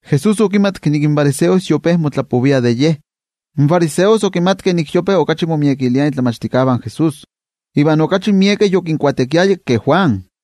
Jesús okimatki ke in fariseos yope motlapoviah de Ye. In fariseos okimatkeh nik yope okachi momiekiliah in momachtijkeh de Jesús iva okachi miekeh yokinbautisarovaya ke Juan.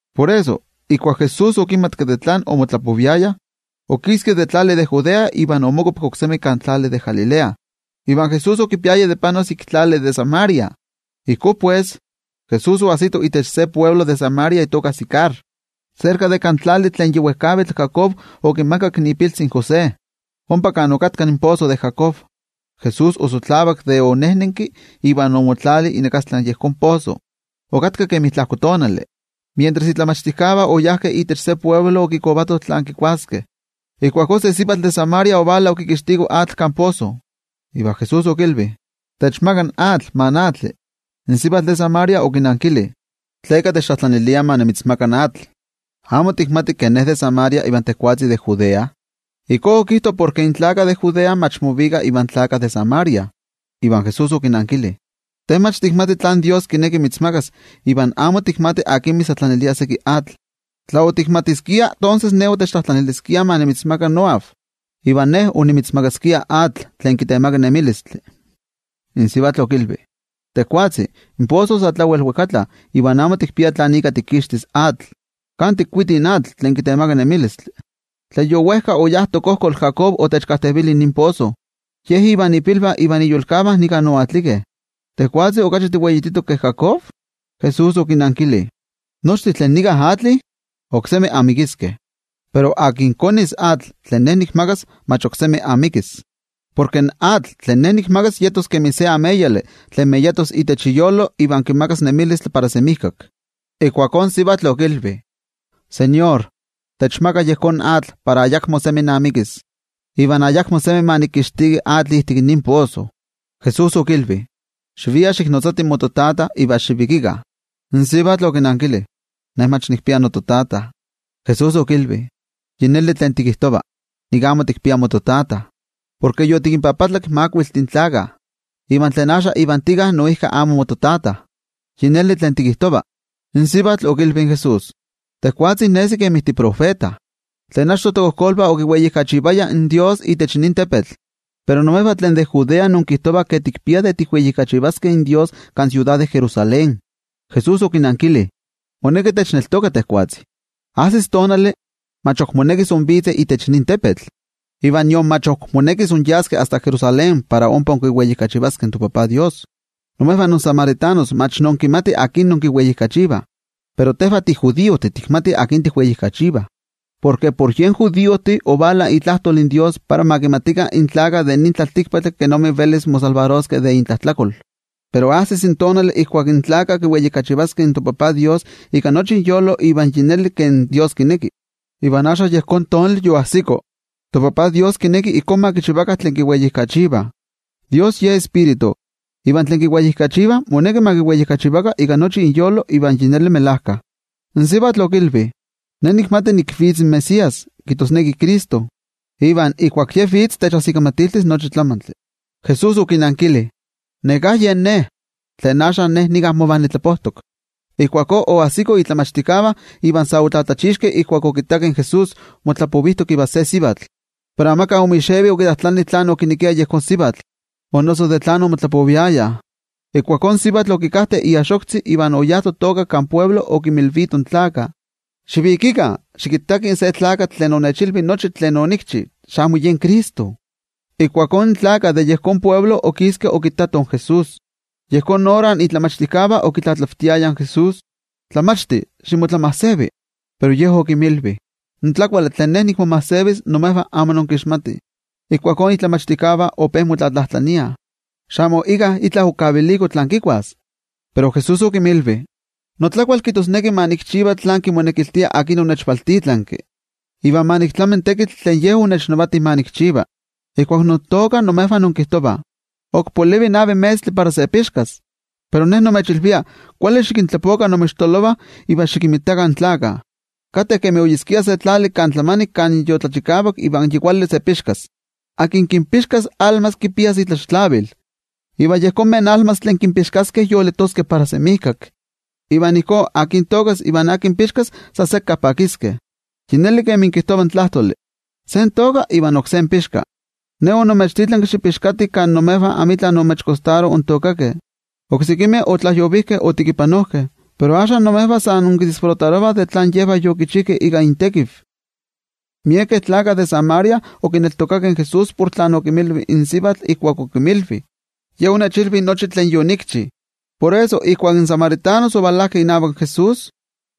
Por eso, ijkuak Jesús okimatki tlen omotlapoviayah, okiski itech tlali de Judea iva omokuapki oksemi itech tlali de Galilea. Iva Jesús okipiaya tlen panos ik tlali de Samaria. Ijkó pues, Jesús oajsito itech se altepetl de Samaria itoka Sicar, serka de kan tlali tlen yi wejkavitl Jacob okimakak ipiltzi José. Ompa kan okatka in poso de Jacob. Jesús osotlavak de onejnenki iva omotlali inakastla yejón poso. Okatka kemi tlajko tonali. Mientras in momachtijkeh oyajkeh itech se altepetl okikovatoh tlen kikuaskeh. Ijkuakó se sivatl de Samaria ovala okikixtiko atl kan poso. Iva Jesús okilvi: —Techtliokoli seki moatzi. In sivatl de Samaria okinankili: —¿Tleka techtlajtlanilia ma nimitzmaka atl? ¿Amo tikmati ke ne de Samaria iva tejwatzi de Judea? (Ijkó okijto porke in judiojtih amo movikah ivan samaritanos.) Iva Jesús okinankili: —Te mach tikmati tlen Dios kineki mitzmakas ivan amo tikmati akin mitztlajtlanilia atl. Tla otikmatiskia, tonses te otiktlajtlaniliskia yen ma nimitzmaka atl, iva ye onimitzmakaskia atl tlen kitemaka nemilistli. In sivatl okilvi: —Tejwatzi, in poso sa tlawel wejkatla iva amo tikpia tlan ika tikixtis atl. ¿Kan tikuiti in atl tlen kitemaka nemilistli? Tlen yowejka oyá tokojkol Jacob otechkajtevili nin poso. Ye ivan ipilvah ivan iyolkavah nika oatlikeh. ¿Tejwatzi okachi tiweititok ke Jacob? Jesús okinankili: —Nochtin tlen nika atlih, oksemi amikiskeh. Pero tlen konis atl tlen Ne nikmakas, mach ok semi amikis. Porke in atl tlen Ne nikmakas yetos kemi se ameyali tlen meyatos itech iyolo iva kimakas nemilistli para semijkak. Ijkuakó in sivatl okilvi: —Tejwatzi, techmaka yejón atl para ayakmo semi namikis, iva ayakmo semi ma nikixtiki atl ijtik nin poso. Jesús okilvi: —Xivia xiknotzati mototata iva nika xikvalika. In sivatl okinankili: —Ne mach nikpia nototata. Jesús okilvi: —Yi neli tlen tikijtova, nik amo tikpia mototata. Porke yotikinpapatlak makuiltih tlakah, iva tlen axka ivan tika noijki amo mototata. Yi neli tlen tikijtova. In sivatl okilvi in Jesús: —Tejwatzi nesi kemi titiotenejmachti. Tlen achto tokojkolvah okiweijkachivayah in Dios itech nin tepetl. Pero imejvah tlen de Judea inkijtovah ke tikpiah de tikweijkachivaskeh in Dios kan siudad de Jerusalén. Jesús okinankili: —Sivatl, moneki techneltoka. Ajsis tonali, mach ok monekis invitzeh itech nin tepetl, iva nion mach ok monekis inyaskeh asta Jerusalén para ompa inkiweijkachivativih in toTajtzin Dios. Imejvah insamaritanos mach inkimatih akin inkiweijkachivah, pero tejvah tijudiojtih tikmatih akin tikweijkachivah, porke por yejvan judiojtih ovala itlajtol in Dios para ma kimatikah in tlaltikpaktlakah kenik velis momakixtiskeh de intlajtlakol. Pero ajsis tonali ijkuak in tlaltikpaktlakah kiweijkachivaskeh in toTajtzin Dios ika Tioijyotzintli iva ika melajkayotl, iva axka yejón tonali yoajsiko. ToTajtzin Dios kineki ijkó ma kichivakah tlen kiweijkachivah. Dios Ye Tioijyotzintli, iva tlen kiweijkachivah moneki ma kiweijkachivakah ika Tioijyotzintli iva ika melajkayotl. In sivatl okilvi: —Ne nikmati nik vitz in Mesías —kijtosneki Cristo—, iva ijkuak Ye vitz, techajsikamatiltis nochi tlamantli. Jesús okinankili: —Neká yen Ne, tlen axka nika mova nimotlapovijtok. Ijkuakó oajsikoh in momachtijkeh iva sa otlatlachixkeh ijkuak okittakeh in Jesús motlapovijtok ivan se sivatl. Pero amika omixevi okitlajtlani tlán okinekia yejón sivatl, o noso de tlán omotlapoviayah. Ijkuakó in sivatl okikajte iaxoktzi iva oyá totoka kan altepetl okinmilvito in gentejtih: —Xivikikah, xikittakih se tlakatl tlen onechilvi nochi tlen onikchi. ¡Xamo yen Cristo! Ijkuakó in gente de yejón altepetl okiskeh okittatoh in Jesús. Yejón ora in momachtijkeh okitlatlavtiayah in Jesús: —Tlamachti, ximotlamajsevi. Pero Ye okinmilvi: —In tlakuali tlen Ne nikmomajsevis imejvah amo inkixmatih. Ijkuakó in momachtijkeh ope motlatlajtlaniah: —¿Xamo íkka itla okaviliko tlen kikuas? Pero Jesús okinmilvi: —Notlakual kijtosneki ma nikchiva tlen kimonekiltia tlen onechvaltitlanki, iva ma niktlami in tekitl tlen Ye onechnavati ma nikchiva. Ijkuak intookah imejvah inkijtovah: “Ok polivi navi metztli para se pixkas.” Pero Ne nimechilvia: Kuali xikintlapokah inmoixtololovah iva xikinmitakah in gentejtih, kateh kemi oyeskia se tlali kan tlamanik kan yotlachikavak iva yi kuali ka para se pixkas. Tlen pixka kipia itlaxtlavil, iva in tlakilotl tlen kipixka yejvan gentejtih tlen yolitoskeh para semijkak. Iva ijkó, tlen tookas iva tlen pixkas, san sekka pakiskeh. Yi neli kemi kijtova in tlajtoli: “Se tooka iva oksé pixka.” Ne onimechtitlanki xipixkatih kan imejvah amitla onmotekimakakeh ontookakeh. Oksekimeh otlajyovijkeh otekipanojkeh, pero axka imejvah sa inkipakittah tlen yejvah yokichijkeh ika intekiv. Miekeh samaritanos otlaneltokakeh inavak Jesús porke in sivatl okinmilvi: “Ye onechilvi nochi tlen yonikchi.” Por eso ijkuak in samaritanos ovalajkeh inavak Jesús,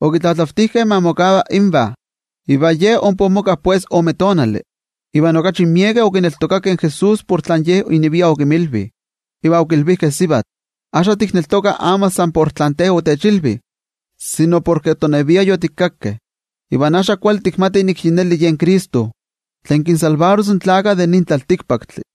okitlatlavtijkeh ma mokava invah. Iva Ye ompa omoka ome tonali. Iva okachi miekeh okineltokakeh in Jesús por tlen Ye inevia okinmilvi. Iva okilvijkeh in sivatl: —Axka tikneltokah amo san por tlen te otechilvi, sino porke toneviah yotikakkeh, iva axka kuali tikmatih nik yi neli yen Cristo, tlen kinmakixtis in tlaltikpaktlakah.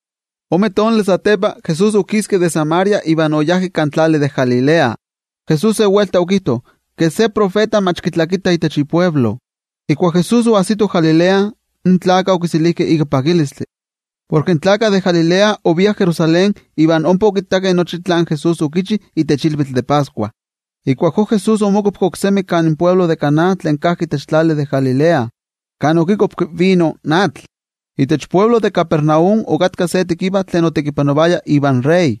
Ome tonali satepa, Jesús okiski de Samaria iva oyá kan tlali de Galilea. Jesús se welta okijto ke se tiotenejmachti mach kitlakitah itech ialtepe. Ijkuak Jesús oajsito Galilea, in gentejtih okiselijkeh ika pakilistli, porke in gentejtih de Galilea oviah Jerusalén iva ompa okittakeh nochi tlen Jesús okichi itech ilvitl de Pascua. Ijkuakó Jesús omokuapki oksemi kan altepetl de Caná tlen kajki itech tlali de Galilea, kan okikuapki vino in atl. Itech altepetl de Capernaum okatka se tekiva tlen otekipanovaya inavak in wei tlanavati,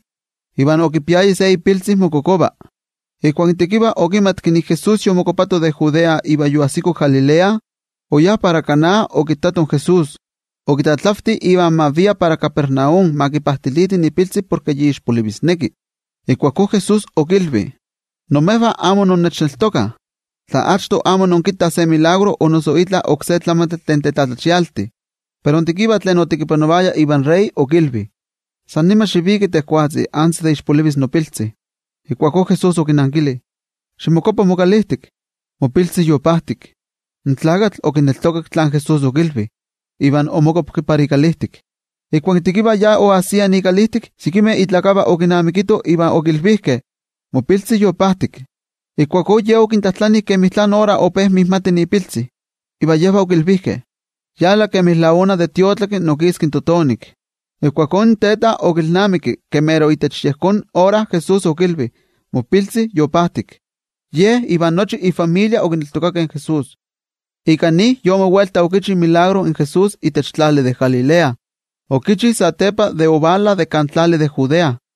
iva okipiaya se ipiltzi mokokova. Ijkuak in tekiva okimatki nik in Jesús yomokuapato de Judea iva yoajsiko Galilea, oyá para Caná okittato in Jesús. Okitlatlavti ma kivika para Capernaum ma kipajtiliti ipiltzi porke yi mero ixpolivi. Ijkuakó Jesús okilvi: —Imejvah amo intlaneltokah, tla amo inkinmitah neskayomeh o noso tetzavimeh. Pero in tekiva tlen otekipanovaya inavak in wei tlanavati okilvi: —San nima xiviki tejwatzi antes de ixpolivis nopiltzi. Ijkuakó Jesús okinankili: —Ximokuapa mokalijtik, mopiltzi yopajtik. In tlakatl okineltokak tlen Jesús okilvi, iva omokuapki para ikalijtik. Ijkuak in tekiva ya onajsia ikalijtik, sekimeh itlakevalvah okinamikitoh iva okilvijkeh: —Mopiltzi yopajtik. Ijkuakó ye okintlajtlani kemi tlán ora ope mijmati ipiltzi. Iva yejvah okilvijkeh: —Yala, kemi la una de tiotlaki okiski in totonik. Ijkuakó in teta okilnamiki ke mero itech yejón ora Jesús okilvi: “Mopiltzi yopajtik.” Ye iva nochi ifamilia okineltokakeh in Jesús. Ika nin, Jesús yi ojpa okichi yejón tetzavkaneskayotl itech tlali de Galilea, okichi satepa de ovala de kan tlali de Judea.